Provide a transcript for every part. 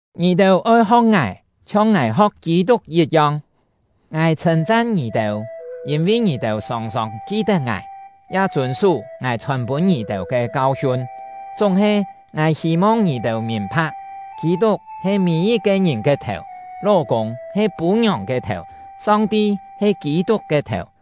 Ngì-têu oi ho̍k ngài, chhiong ngài ho̍k Kî-tuk yit-yong. Ngài chhṳ̂n-chan ngì-têu, yîn-vi ngì-têu sòng-sòng ki-tet ngài, ya chûn-sú ngài chhòn pûn ngì-têu ke kau-hiun. Chúng-he, ngài hî-mong ngì-têu mìn-pha̍k, Kî-tuk he mî-yit-ke ngìn ke thèu; ló-kûng he pû-ngiòng ke thèu; Song-ti he Kî-tuk ke thèu.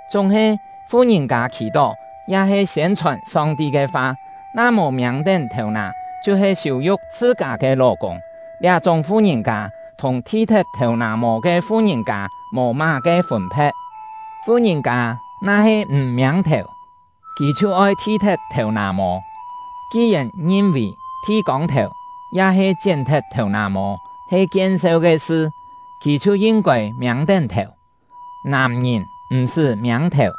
Chúng-he, fu-ngìn-kâ khì-tó ya-he siên-chhòn Song-ti ke fa, na mò miâng-tén thèu-nà chhiu-he siû-yu̍k chhṳ-kâ ke ló-kûng. Liá-chúng fu-ngìn-kâ thùng thi-thet thèu-nà-mô ke fu-ngìn-kâ mò má-ke fûn-phe̍t. Fu-ngìn-kâ na-he m̀ miâng-thèu, kì chhiu oi thi-thet thèu-nà-mô; ki-yèn ngin-vì thi-kông-thèu ya-he chién-thet thèu-nà-mô he kien-seu ke sṳ, kì chhiu yin-kôi miâng-tén thèu. Nàm-ngìn m̀-sṳ́ miâng-thèu,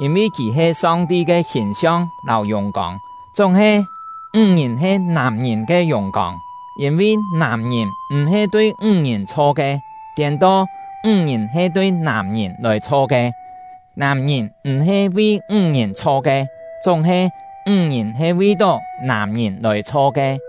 yîn-vi kì he Song-ti ke hìn-siong lâu yùng-kông; chúng-he, ńg-ngìn he nàm-ngìn ke yùng-kông. Yîn-vi nàm-ngìn m̀-he tui ńg-ngìn chho ke, tiên-to, ńg-ngìn he tui nàm-ngìn lòi chho ke; nàm-ngìn m̀-he vi ńg-ngìn chho ke, chúng-he, ńg-ngìn he vi-tó nàm-ngìn lòi chho ke.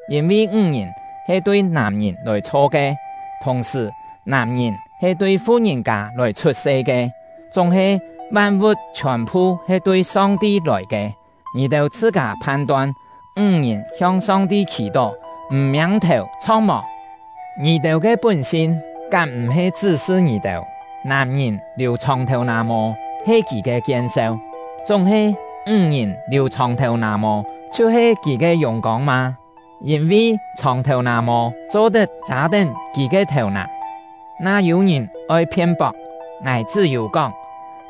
Yîn-vi ńg-ngìn he tui nàm-ngìn lòi chho ke, thùng-sṳ̀ nàm-ngìn he tui fu-ngìn-kâ lòi chhut-se ke, chúng-he van-vu̍t chhiòn-phu he tui Song-ti lòi ke. Ngì-têu chhṳ-kâ phan-ton! Ńg-ngìn hiong Song-ti khì-tó, m̀ miâng-thèu chho̍k mò? Ngì-têu ke pún-sin kám m̀-he chṳ́-sṳ ngì-têu, nàm-ngìn liù chhòng thèu-nà-mô he kì ke kien-seu, chúng-he ńg-ngìn liù chhòng thèu-nà-mô chhiu-he kì ke yùng-kông mâ? Yîn-vi chhòng thèu-nà-mô cho-tet châ-tén kì ke thèu-nà. Na yû-ngìn oi phien-pok, ngài chṳ́-yû kóng,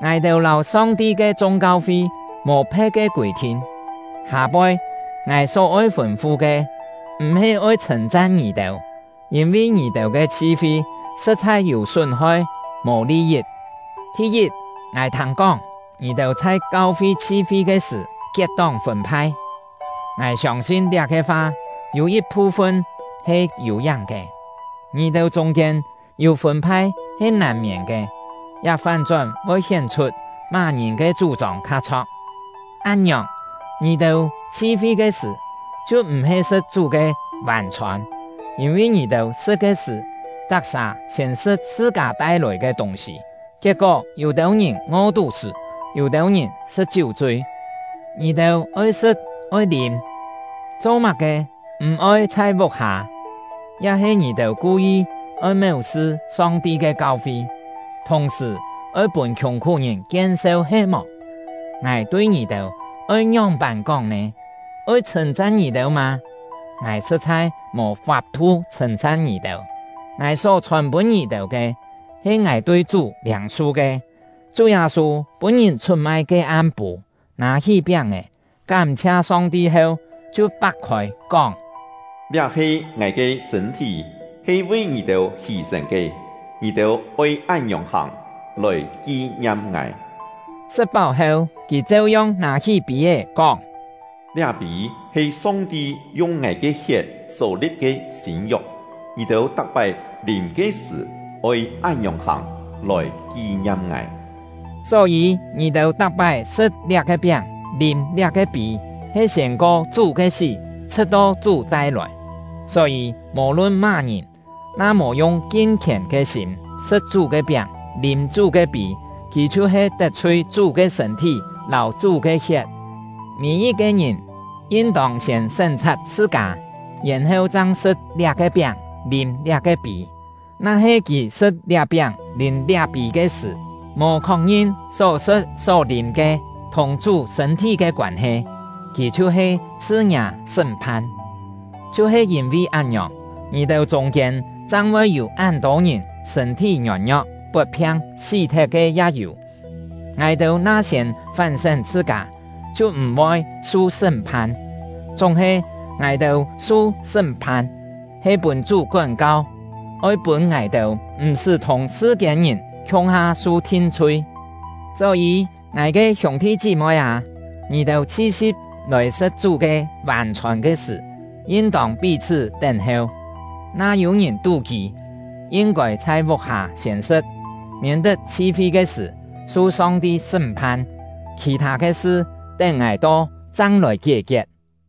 ngài-têu lâu Song-ti ke chung kau-fi mò phe̍t ke kûi-thin. Hâ-poi, ngài só-oi fûn-fu ke, m̀-he oi chhṳ̂n-chan ngì-têu, yîn-vi ngì-têu ke chhi-fi sṳ̍t-chhai yû sún-hoi mò li-yit. Thi-yit, ngài thâng-kóng, ngì-têu chhai kau-fi chhi-fi ke sṳ̀ kiet-tóng fûn-phai. Ngài siông-sin liá-ke fa yû yit-phu-fun he yû-yáng ke. (Ngì-têu chûng-kiên yû fûn-phai he nàn-miên ke; liá fán-chón voi hién-chhut má-ngìn ke chú-chông kha chho̍k.) Án-ngiòng, ngì-têu chhi-fi ke sṳ̀, chhiu m̀-he sṳ̍t Chú ke Vân-chhôn. Yîn-vi ngì-têu sṳ̍t ke sṳ̀, tak-sà siên sṳ̍t chhṳ-kâ tai-lòi ke tûng-sî, kiet-kó yû-têu ngìn ngo-tú-sṳ́, yû-têu ngìn sṳ̍t chiú-chui. Ngì-têu oi sṳ̍t oi lîm, cho-má-ke m̀-oi chhai vuk-hâ? Ya-he ngì-têu ku-yi oi méu-sṳ Song-ti ke kau-fi, thùng-sṳ̀ oi pûn khiùng-khú-ngìn kien-seu he-mò? Ngài tui ngì-têu oi ngióng-pân kóng nè? Oi chhṳ̂n-chan ngì-têu mâ? Ngài sṳ̍t-chhai mò fap-thu chhṳ̂n-chan ngì-têu! Ngài só chhòn-pûn ngì-têu ke, he ngài tui Chú liâng-su ke: Chú Yâ-sû pûn-ngìn chhut-mai ke am-pû, nâ-hí piáng-è, kám-chhia Song-ti heu, chhiu pak-khôi, kóng: “Liá he ngài ke sṳ̂n-thí, he vi ngì-têu hî-sên ke; ngì-têu oi án-ngiòng hàng, lòi ki-ngiam ngài.” Sṳ̍t-páu heu, kì cheu-yong nâ-hí pî-é, kóng: “Liá pî he Song-ti yung ngài ke hiet só-li̍p ke sîn-yok; ngì-têu tak-pái lîm ke sṳ̀, oi án-ngiòng hàng, lòi ki-ngiam ngài.” Só-yî, ngì-têu tak-pái sṳ̍t liá-ke piáng, lîm liá-ke pî, he siên-ko Chú ke sí, chhṳ̍t-to Chú chai-lòi. Só-yî, mò-lun má-ngìn, na mò yung kin-khièn ke sîm sṳ̍t Chú ke piáng, lîm Chú ke pî, kì chhiu-he tet-chhui Chú ke sṳ̂n-thí lâu Chú ke hiet. Mî-yit-ke ngìn yin-tông siên sén-chhat chhṳ-kâ, yèn-heu chang sṳ̍t liá-ke piáng, lîm liá-ke pî. Na-he kì sṳ̍t liá piáng lîm liá pî ke sṳ̀, mò khok-ngin só-sṳ̍t só-lîm ke thùng Chú sṳ̂n-thí ke koân-he, kì chhiu-he chhṳ ngiâ sṳ́m-phan. Chhiu-he yîn-vi án-ngiòng, ngì-têu chûng-kiên chang voi yû án-tô ngìn sṳ̂n-thí ngiôn-ngio̍k, pot-phiang, sí-thet ke ya yû. Ngài-têu na siên fán-sén chhṳ-kâ, chhiu m̀-voi su sṳ́m-phan. Chúng-he, ngài-têu su sṳ́m-phan, he pûn Chú kón-kau, oi pûn ngài-têu m̀-sṳ́ thùng sṳ-kiên-ngìn khiung-ha su thin-chhui. Só-yî, ngài ke hiûng-thi chí-moi â, ngì-têu chhi-si̍p lòi sṳ̍t Chú ke Vân-chhôn ke sṳ̀, yin-tông pí-chhṳ́ tén-heu. Na yû-ngìn tú-kî, yin-kôi chhai vuk-hâ siên sṳ̍t, miên-tet chhi-fi ke sṳ̀, su Song-ti sṳ́m-phan. Khì-thâ ke sṳ, tén ngài to, chang lòi kié-kiet.